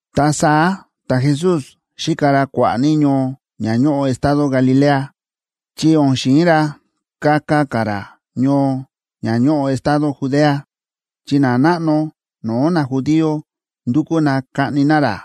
Ta saá ta̱Jesús xíka ra kua̱ꞌa̱ ní ñoo ña ñóꞌo estado Galilea, chi o̱n xi̱in ra kaka ka̱ ra ñoo ña ñóꞌo estado Judea, chi nanáꞌno no̱o̱ najudío ndúkú na kaꞌni na ra.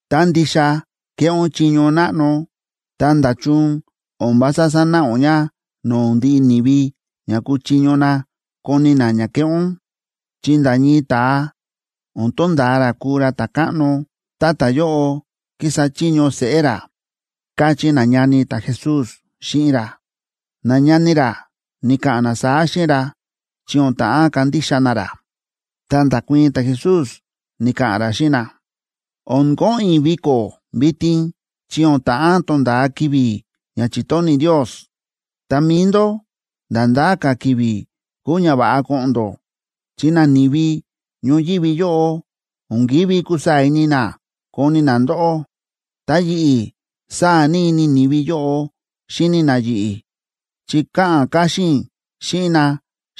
Tá ndixa kéꞌé ún chiño náꞌno, ta, ¿nda̱chun o̱n vása sanáꞌa ún ña no̱o̱ ndiꞌi ni̱vi ña kuchiño na koni na ña kéꞌé ún? Chi nda̱ ñii ta̱a o̱n tonda̱a ra kuu ra ta̱káꞌno, tá ta̱yóꞌo kísa chiño seꞌé ra ―káchí nañani ta̱Jesús xíꞌin ra. Nañani ra ni̱ka̱ꞌa̱n na saá xíꞌin ra chi o̱n ta̱ꞌán kandixa na ra. Ta nda̱kuii̱n ta̱Jesús, ni̱ka̱ꞌa̱n ra xíꞌin na: ―O̱n ko̱ꞌo̱n i̱ viko̱ vitin chi o̱n ta̱ꞌán tonda̱a ki̱vi̱ ña chi̱tóni̱ Ndios. Ta mi̱i ndó, nda̱ ndá ka̱ ki̱vi̱ kúu ña va̱ꞌa ko̱ꞌo̱n ndó, chi nani̱vi ñoyívi yóꞌo o̱n ki̱ví kusaa̱ ini na koni na ndóꞌó. Ta yi̱ꞌi̱, sáa̱ ní ini ni̱vi yóꞌo xíni na yi̱ꞌi̱, chi káꞌa̱n káxín i̱ xíꞌin na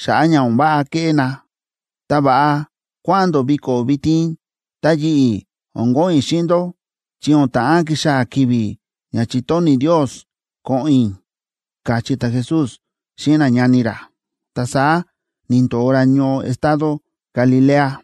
xa̱ꞌa̱ ña o̱n váꞌa kéꞌé na. Ta va̱ꞌa kua̱ꞌa̱n ndó viko̱ vitin, ta yi̱ꞌi̱, o̱n ko̱ꞌo̱n i̱ xíꞌin ndó, chi o̱n ta̱ꞌán kixaa̱ ki̱vi̱ ña chi̱tóni̱ Ndios ko̱ꞌo̱n i̱ ―káchí ta̱Jesús xíꞌin nañani ra. Ta saá ni̱ndo̱o ra ñoo estado Galilea.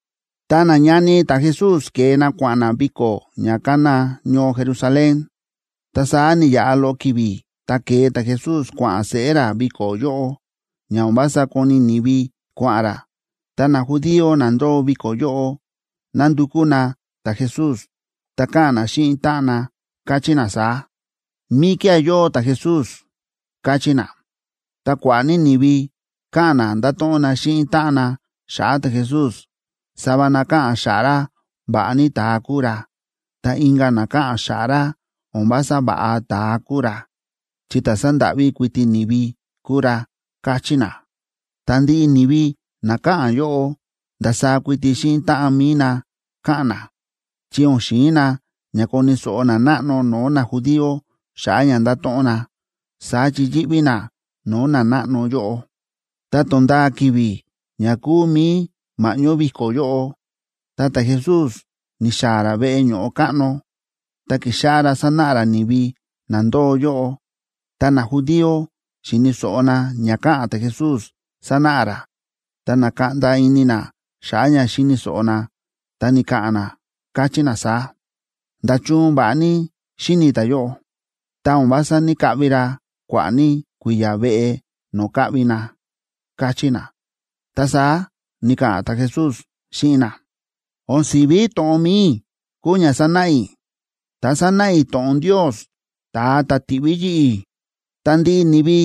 Ta nañani ta̱Jesús ke̱e na kua̱ꞌa̱n na viko̱ ña kána ñoo Jerusalén. Ta saá ni̱yaꞌa loꞌo ki̱vi̱, ta ke̱e ta̱Jesús kua̱ꞌa̱n seꞌé ra viko̱ yóꞌo, ña o̱n vása koni ni̱vi kua̱ꞌa̱n ra. Ta najudío na ndóo viko̱ yóꞌo nándukú na ta̱Jesús, ta káꞌa̱n na xíꞌin táꞌan na, káchí na saá: ―¿Míkía̱ yóo ta̱Jesús? ―káchí na. Ta kua̱ꞌa̱ ní ni̱vi káꞌa̱n na ndáto̱ꞌon na xíꞌin táꞌan na xa̱ꞌa̱ ta̱Jesús. Sava na káꞌa̱n xa̱ꞌa̱ ra va̱ꞌa ní ta̱a kúu ra, ta inka̱ na káꞌa̱n xa̱ꞌa̱ ra o̱n vása va̱ꞌa ta̱a kúu ra, chi ta̱ sándáꞌví kuiti ni̱vi kúu ra, káchí na. Ta ndiꞌi ni̱vi na káꞌa̱n yóꞌo, ndasaá kuiti xíꞌin táꞌan mi̱i na káꞌa̱n na, chi o̱n xi̱in na ña koni̱ so̱ꞌo nanáꞌno no̱o̱ najudío xa̱ꞌa̱ ña nda̱to̱ꞌon na. Saá chi yíꞌví na no̱o̱ nanáꞌno yóꞌo. Ta to̱nda̱a ki̱vi̱ ña kúu mi̱i ma̱ꞌñó viko̱ yóꞌo, ta ta̱Jesús ni̱xaa̱ ra veꞌe ño̱ꞌo káꞌno, ta ki̱xáꞌá ra sanáꞌa ra ni̱vi na ndóo yóꞌo. Tá najudío xi̱ni̱ so̱ꞌo na ña káꞌa̱n ta̱Jesús sánáꞌa ra, ta na̱kaꞌnda ini na xa̱ꞌa̱ ña xi̱ni̱ so̱ꞌo na, ta ni̱ka̱ꞌa̱n na, káchí na saá: ―¿Nda̱chun va̱ꞌa ní xíni̱ ta̱yóꞌo?, ta o̱n vása ní‑kaꞌvi ra kua̱ꞌa̱ ní kui̱ya̱ veꞌe no̱o̱ káꞌvi na ―káchí na. Ta saá ni̱ka̱ꞌa̱n ta̱Jesús xíꞌin na: ―O̱n si̱ví to̱ꞌon mi̱i i̱ kúu ña sánáꞌa i̱, ta sánáꞌa i̱ to̱ꞌon Ndios, ta̱a ta̱ ti̱ꞌví yi̱ꞌi̱. Ta ndiꞌi ni̱vi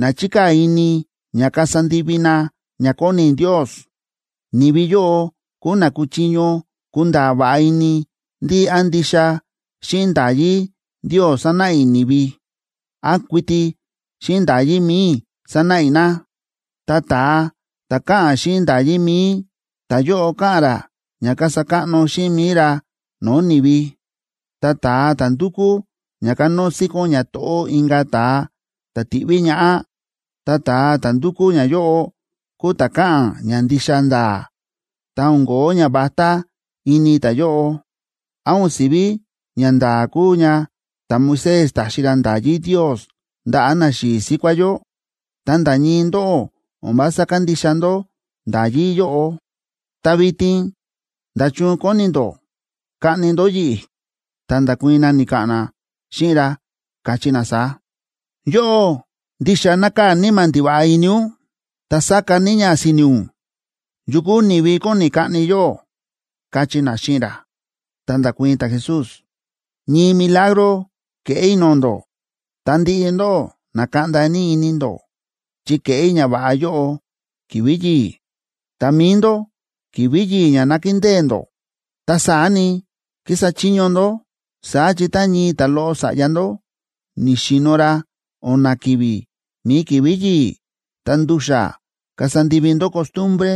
na chíkaa̱ ini ña kasa ndivi na ña kóni Ndios, ni̱vi yóꞌo kúu na kúchiño kunda̱a̱ va̱ꞌa ini ndí án ndixa xíꞌin nda̱yí Ndios sánáꞌa i̱ ni̱vi, án kuiti xíꞌin nda̱yí mi̱i i̱ sánáꞌa i̱ na. Ta ta̱a ta̱ káꞌa̱n xíꞌin nda̱yí mi̱i, ta̱yóꞌo káꞌa̱n ra ña kasa káꞌno xíꞌin mi̱i ra no̱o̱ ni̱vi. Ta ta̱a ta̱ ndúkú ña kanóo síkón ñato̱ꞌó inka̱ ta̱a ta̱ ti̱ꞌví ñaꞌá, ta ta̱a ta̱ ndúkú ñayóꞌo kúu ta̱ káꞌa̱n ña ndixa nda̱a̱, ta o̱n ko̱ó ñavatá ini ta̱yóꞌo. ’¿Án o̱n sivi ñanda̱a̱ kúu ña ta̱Moisés ta̱xi ra nda̱yí Ndios ndaꞌa̱ naxi̱i̱ síkuá yó? Ta nda̱ ñii ndóꞌó o̱n vása kándixa ndó nda̱yí yóꞌo. Ta vitin, ¿nda̱chun kóni ndó kaꞌni ndó yi̱ꞌi̱? Ta nda̱kuii̱n na, ni̱ka̱ꞌa̱n na xíꞌin ra, káchí na saá: ―Yóꞌó, ¡ndixa nákaa̱ níma̱ ndiva̱ꞌa ini ún, ta sáka ní ña si̱ni̱ ún! ¿Yu kúu ni̱vi kóni kaꞌni yóꞌó? ―káchí na xíꞌin ra. Ta nda̱kuii̱n ta̱Jesús: ―Ñii milagro ke̱ꞌé i̱ no̱o̱ ndó, ta ndiꞌi ndóꞌó na̱kaꞌnda ní ini ndó, chi ke̱ꞌé i̱ ñava̱ꞌa yóꞌo ki̱vi̱ yi̱i̱. Ta mi̱i ndó, ki̱vi̱ yi̱i̱ ña nákindée ndó, ta saá ni, kísa chiño ndó. Saá chi tá ñii ta̱loꞌo sa̱ꞌya ndó ni̱xi̱no̱ ra o̱na̱ ki̱vi̱ mi̱i ki̱vi̱ yi̱i̱, ta ndu̱xa̱ kasa ndivi ndó costumbre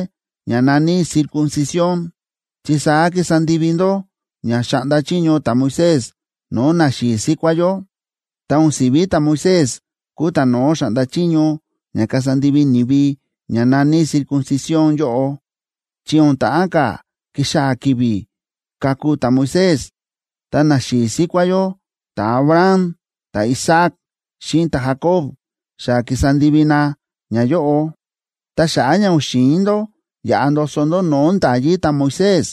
ña na̱ní circuncisión,b chi saá kísa ndivi ndó ña xa̱ꞌnda chiño ta̱Moisés no̱o̱ naxi̱i̱ síkuá yó. (Ta o̱n si̱ví ta̱Moisés kúu ta̱no̱ó xa̱ꞌnda chiño ña kasa ndivi ni̱vi ña na̱ní circuncisión yóꞌo, chi o̱n ta̱ꞌán ka̱ kixaa̱ ki̱vi̱ ka̱ku ta̱Moisés, ta naxi̱i̱ síkuá yó ta̱Abraham, ta̱Isaac, xíꞌin ta̱Jacob xa ki̱sa ndivi na ñayóꞌo.) Ta xa̱ꞌa̱ ña o̱n xi̱in ndó yaꞌa ndoso ndó no̱o̱ nda̱yí ta̱Moisés,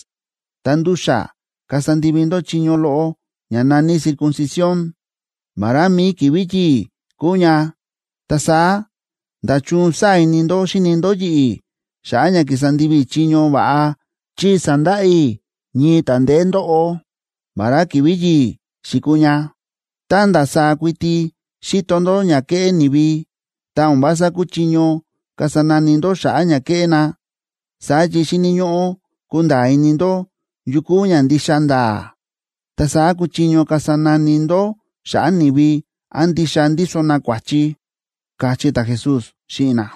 ta ndu̱xa̱ kasa ndivi ndó chiño loꞌo ña na̱ní circuncisión, vará mi̱i ki̱vi̱ yi̱i̱ kúu ña. Ta saá, ¿nda̱chun sáa̱ ini ndó xíni ndó yi̱ꞌi̱ xa̱ꞌa̱ ña ki̱sa ndivi i̱ chiño va̱ꞌa, chi sa̱ndaꞌa i̱ ñii ta̱ ndeé ndóꞌo, vará ki̱vi̱ yi̱i̱ xi̱kuu ña? Tá ndasaá kuiti xíto ndó ña kéꞌé ni̱vi, ta o̱n vása kúchiño kasa nani ndó xa̱ꞌa̱ ña kéꞌé na. Saá chi xíni̱ ñóꞌó kunda̱a̱ ini ndó yu kúu ña ndixa nda̱a̱, ta saá kuchiño kasa nani ndó xa̱ꞌa̱ ni̱vi án ndixa ndíso na kua̱chi ―káchí ta̱Jesús xíꞌin na.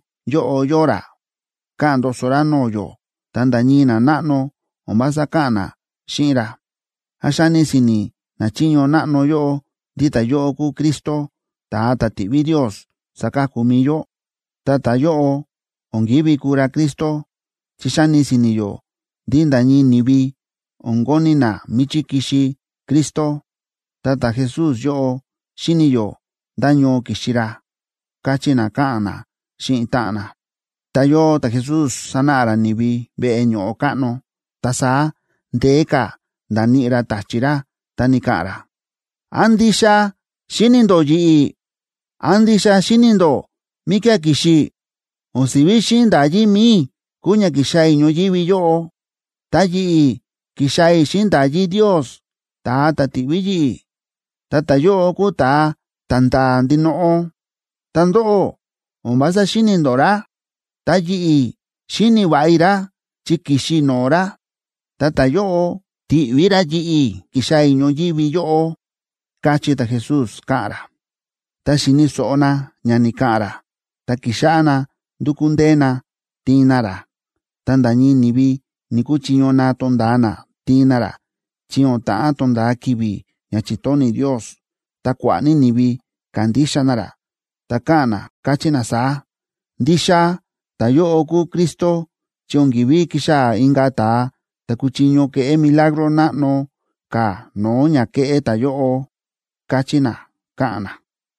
Ta vitin yóꞌo yóo ra, káꞌa̱n ndoso ra no̱o̱ yó, ta nda̱ ñii nanáꞌno o̱n vása káꞌa̱n na xíꞌin ra. ¿Án xáni si̱ni̱ nachiño náꞌno yóꞌo ndí ta̱yóꞌo kúu Cristo, ta̱a ta̱ ti̱ꞌví Ndios saka̱ku mi̱i yó? Ta ta̱yóꞌo o̱n ki̱ví kuu ra Cristo, chi xáni si̱ni̱ yó ndí nda̱ ñii ni̱vi o̱n koni̱ na míchí ki̱xi Cristo. Ta ta̱Jesús yóꞌo, xíni̱ yó ndá ñoo ki̱xi ra ―káchí na, káꞌa̱n na xíꞌin táꞌan na. Ta yóo ta̱Jesús sánáꞌa ra ni̱vi veꞌe ño̱ꞌo káꞌno, ta saá ndeé ka̱ nda̱níꞌi ra ta̱chi̱ ra, ta ni̱ka̱ꞌa̱n ra: ―¿Án ndixa xíni̱ ndó yi̱ꞌi̱? ¿Án ndixa xíni̱ ndó míkía̱ ki̱xi i̱? O̱n si̱ví xíꞌin nda̱yí mi̱i i̱ kúu ña ki̱xaa̱ i̱ ñoyívi yóꞌo, ta yi̱ꞌi̱ ki̱xaa̱ i̱ xíꞌin nda̱yí Ndios, ta̱a ta̱ ti̱ꞌví yi̱ꞌi̱, ta ta̱yóꞌo kúu ta̱a ta̱nda̱a̱ ndinoꞌo. Ta ndóꞌó, o̱n vása xíni̱ ndó ra. Ta yi̱ꞌi̱, xíni̱ va̱ꞌa i̱ ra chi ki̱xi i̱ no̱o̱ ra, ta ta̱yóꞌo ti̱ꞌví ra yi̱ꞌi̱ ki̱xaa̱ i̱ ñoyívi yóꞌo ―káchí ta̱Jesús, káꞌa̱n ra. Tá xi̱ni̱ so̱ꞌo na ña ni̱ka̱ꞌa̱n ra, ta ki̱xáꞌá na ndu̱kú ndee na tiin na ra, ta nda̱ ñii ni̱vi ni̱‑kuchiño na tonda̱a na tiin na ra, chi o̱n ta̱ꞌán tonda̱a ki̱vi̱ ña chi̱tóni̱ Ndios. Ta kua̱ꞌa̱ ní ni̱vi ka̱ndixa na ra, ta káꞌa̱n na, káchí na saá: ―Ndixa ta̱yóꞌo kúu Cristo, chi o̱n ki̱ví kixaa̱ inka̱ ta̱a ta̱ kuchiño keꞌé milagro náꞌno ka̱ no̱o̱ ña kéꞌé ta̱yóꞌo ―káchí na, káꞌa̱n na.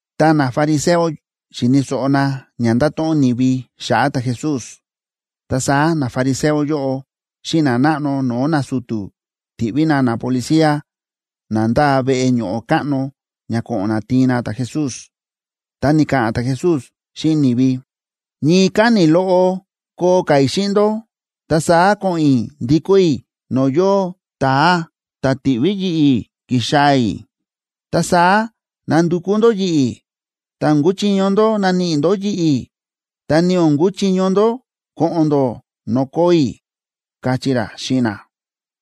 Ta nafariseo xi̱ni̱ so̱ꞌo na ña nda̱to̱ꞌon ni̱vi xa̱ꞌa̱ ta̱Jesús. Ta saá nafariseo yóꞌo xíꞌin nanáꞌno no̱o̱ nasu̱tu̱ ti̱ꞌví na napolicía na ndáa veꞌe ño̱ꞌo káꞌno ña ko̱ꞌo̱n na tiin na ta̱Jesús. Ta ni̱ka̱ꞌa̱n ta̱Jesús xíꞌin ni̱vi: ―Ñii káni̱ loꞌo koo ka̱ i̱ xíꞌin ndó, ta saá ko̱ꞌo̱n i̱ ndikó i̱ no̱o̱ yóo ta̱a ta̱ ti̱ꞌví yi̱ꞌi̱ ki̱xaa̱ i̱. Ta saá nandukú ndó yi̱ꞌi̱, ta o̱n kuchiño ndó naníꞌi ndó yi̱ꞌi̱, ta ni o̱n kuchiño ndó ko̱ꞌo̱n ndó no̱o̱ koo i̱ ―káchí ra xíꞌin na.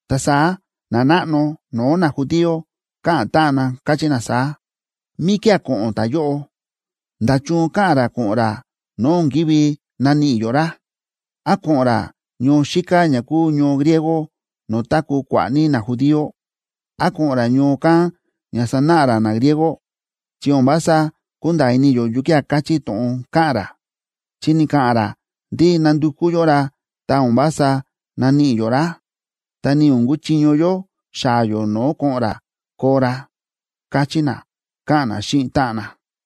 Ta saá nanáꞌno no̱o̱ najudío káꞌa̱n táꞌan na, káchí na saá: ―¿Míkía̱ ko̱ꞌo̱n ta̱yóꞌo? ¿Nda̱chun káꞌa̱n ra ko̱ꞌo̱n ra no̱o̱ o̱n kívi naníꞌi yó ra? ¿Án ko̱ꞌo̱n ra ñoo xíká ña kúu ñoo griego no̱o̱ táku̱ kua̱ꞌa̱ ní najudío? ¿Án ko̱ꞌo̱n ra ñoo kán ña sanáꞌa ra nagriego? Chi o̱n vása kúnda̱a̱ ini yó yukía̱ káchí to̱ꞌon káꞌa̱n ra, chi ni̱ka̱ꞌa̱n ra ndí nandukú yó ra ta o̱n vása naníꞌi yó ra, ta ni o̱n kuchiño yó xaa̱ yó no̱o̱ ko̱ꞌo̱n ra koo ra ―káchí na, káꞌa̱n na xíꞌin táꞌan na.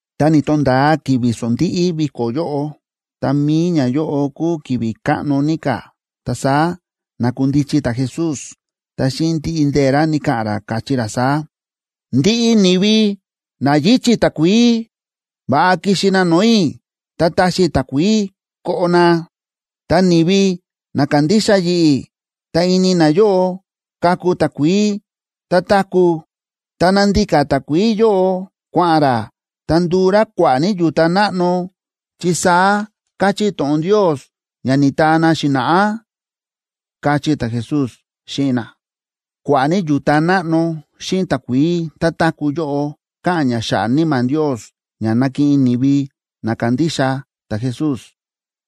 Ta ni̱to̱nda̱a ki̱vi̱ sondíꞌí viko̱ yóꞌo, ta mi̱i ñayóꞌo kúu ki̱vi̱ káꞌno ní ka̱. Ta saá na̱kundichi ta̱Jesús, ta xíꞌin ndiꞌi ndee̱ ra ni̱ka̱ꞌa̱n ra, káchí ra saá: ―Ndiꞌi ni̱vi na yíchi̱ ní takuií, va̱ꞌa kixi na no̱o̱ i̱, ta taxi i̱ takuií koꞌo na. Ta ni̱vi na kandixa yi̱ꞌi̱, ta ini nayóꞌo kaku takuií tá táku̱, ta na̱ndika takuií yóꞌo kua̱ꞌa̱n rá, ta nduu rá kua̱ꞌa̱ ní yu̱ta náꞌno, chi saá káchí to̱ꞌon Ndios ña ni̱taa na xi̱na̱ꞌá ―káchí ta̱Jesús xíꞌin na. Kua̱ꞌa̱ ní yu̱ta náꞌno xíꞌin takuií tá táku̱ yóꞌo káꞌa̱n ña xa̱ꞌa̱ Níma̱ Ndios ña nakiꞌin ni̱vi na kandixa ta̱Jesús.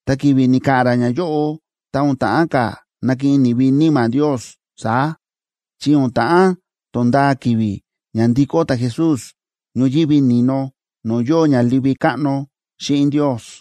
Ta ki̱vi̱ ni̱ka̱ꞌa̱n ra ñayóꞌo, ta o̱n ta̱ꞌán ka̱ nakiꞌin ni̱vi Níma̱ Ndios saá, chi o̱n ta̱ꞌán tonda̱a ki̱vi̱ ña ndi̱kó ta̱Jesús ñoyívi ni̱no no̱o̱ yóo ña livi káꞌno xíꞌin Ndios.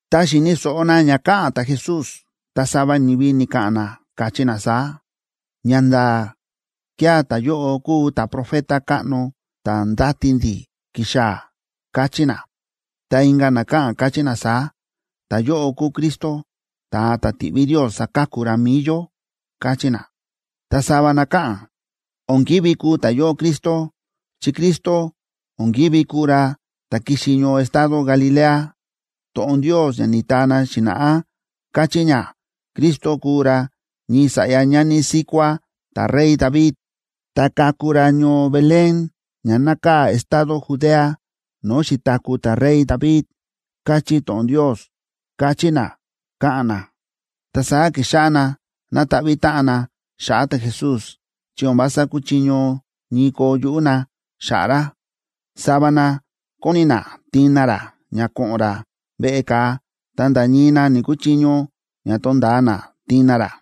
Tá xi̱ni̱ so̱ꞌo na ña káꞌa̱n ta̱Jesús, ta sava ni̱vi ni̱ka̱ꞌa̱n na, káchí na saá: ―Ñanda̱a̱ kía̱ ta̱yóꞌo kúu ta̱profeta káꞌno ta̱ ndáti ndi̱ kixaa̱ ―káchí na. Ta inka̱ na káꞌa̱n, káchí na saá: ―Ta̱yóꞌo kúu Cristo, ta̱a ta̱ ti̱ꞌví Ndios saka̱ku ra mi̱i yó ―káchí na. Ta sava na káꞌa̱n: ―O̱n ki̱ví kuu ta̱yóꞌo Cristo chi Cristo o̱n ki̱ví kuu ra ta̱ ki̱xi ñoo estado Galilea. To̱ꞌon Ndios ña ni̱taa na xi̱na̱ꞌá káchí ña Cristo kuu ra ñii sa̱ꞌya ñani síkuá ta̱rey David, ta kaku ra ñoo Belén ña nákaa̱ estado Judea no̱o̱ xi̱taku̱ ta̱rey David, káchí to̱ꞌon Ndios ―káchí na, káꞌa̱n na. Ta saá ki̱xáꞌá na nataꞌví táꞌan na xa̱ꞌa̱ ta̱Jesús, chi o̱n vása kúchiño ñii koo yuꞌú na xa̱ꞌa̱ ra. Sava na kóni na tiin na ra ña ko̱ꞌo̱n ra veꞌe ka̱a, ta nda̱ ñii na ni̱‑kuchiño ña tonda̱a na tiin na ra.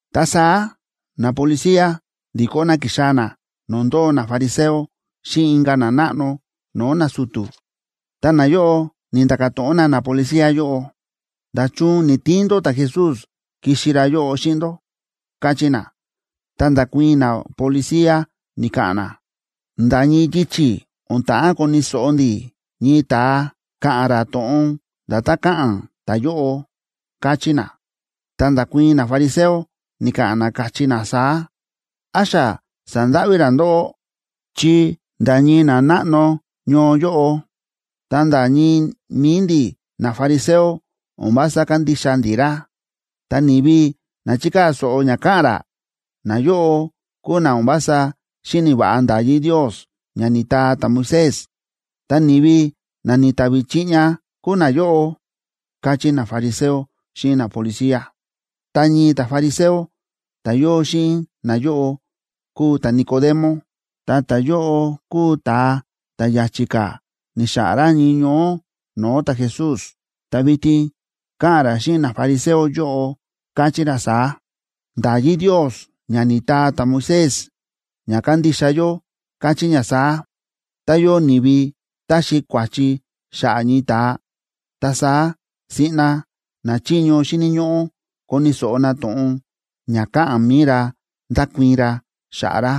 Ta saá napolicía ndi̱kó na ki̱xaa̱ na no̱o̱ ndóo nafariseo xíꞌin inka̱ nanáꞌno no̱o̱ nasu̱tu̱. Ta nayóꞌo ni̱nda̱ka̱ to̱ꞌon na napolicía yóꞌo: ―¿Nda̱chun ni̱‑tiin ndó ta̱Jesús kixi ra yóꞌo xíꞌin ndó? ―káchí na. Ta nda̱kuii̱n napolicía ni̱ka̱ꞌa̱n na: ―Nda̱ ñii yichi̱ o̱n ta̱ꞌán koni̱ so̱ꞌo ndi̱ ñii ta̱a káꞌa̱n ra to̱ꞌon nda̱tán káꞌa̱n ta̱yóꞌo ―káchí na. Ta nda̱kuii̱n nafariseo, ni̱ka̱ꞌa̱n na, káchí na saá: ―¿Án xa sa̱ndáꞌví ra ndóꞌó? Chi nda̱ ñii nanáꞌno ñoo yóꞌo, ta nda̱ ñii mi̱i ndi̱ nafariseo o̱n vása kándixa ndi̱ ra. Ta ni̱vi na chíkaa̱ so̱ꞌo ña káꞌa̱n ra, nayóꞌo kúu na o̱n vása xíni̱ va̱ꞌa nda̱yí Ndios ña ni̱taa ta̱Moisés, ta ni̱vi na ni̱ta̱vi̱ chiꞌña kúu nayóꞌo ―káchí nafariseo xíꞌin napolicía. Ta ñii ta̱fariseo ta̱ yóo xíꞌin nayóꞌo kúu ta̱Nicodemo, ta ta̱yóꞌo kúu ta̱a ta̱ ya̱chi̱ ka̱ ni̱xa̱ꞌa̱n ra ñii ñoó no̱o̱ ta̱Jesús. Ta vitin káꞌa̱n ra xíꞌin nafariseo yóꞌo, káchí ra saá: ―Nda̱yí Ndios ña ni̱taa ta̱Moisés ña kándixa yó káchí ña saá: Tá yóo ni̱vi taxi kua̱chi xa̱ꞌa̱ ñii ta̱a, ta saá siꞌna nachiño xíni̱ ñóꞌó koni̱ so̱ꞌo na to̱ꞌon ña ka̱ꞌa̱n mi̱i ra ndakuii̱n ra xa̱ꞌa̱ ra.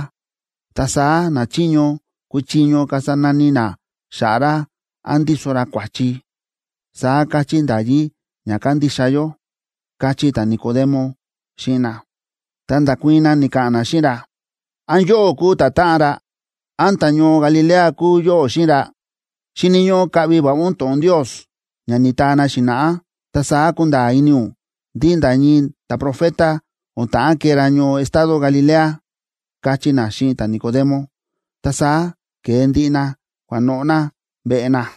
Ta saá nachiño kuchiño kasa nani na xa̱ꞌa̱ ra án ndíso ra kua̱chi. Saá káchí nda̱yí ña kándixa yó ―káchí ta̱Nicodemo xíꞌin na. Ta nda̱kuii̱n na, ni̱ka̱ꞌa̱n na xíꞌin ra: ―¿Án yóꞌó kúu ta̱táꞌan ra? ¿Án ta̱ñoo Galilea kúu yóꞌó xíꞌin ra? Xíni̱ ñóꞌó kaꞌvi va̱ꞌa ún to̱ꞌon Ndios ña ni̱taa na xi̱na̱ꞌá, ta saá kunda̱a̱ ini ún ndí nda̱ ñii ta̱profeta o̱n ta̱ꞌán kee ra ñoo estado Galilea ―káchí na xíꞌin ta̱Nicodemo. Ta saá ke̱e ndiꞌi na kua̱noꞌo̱ na veꞌe na.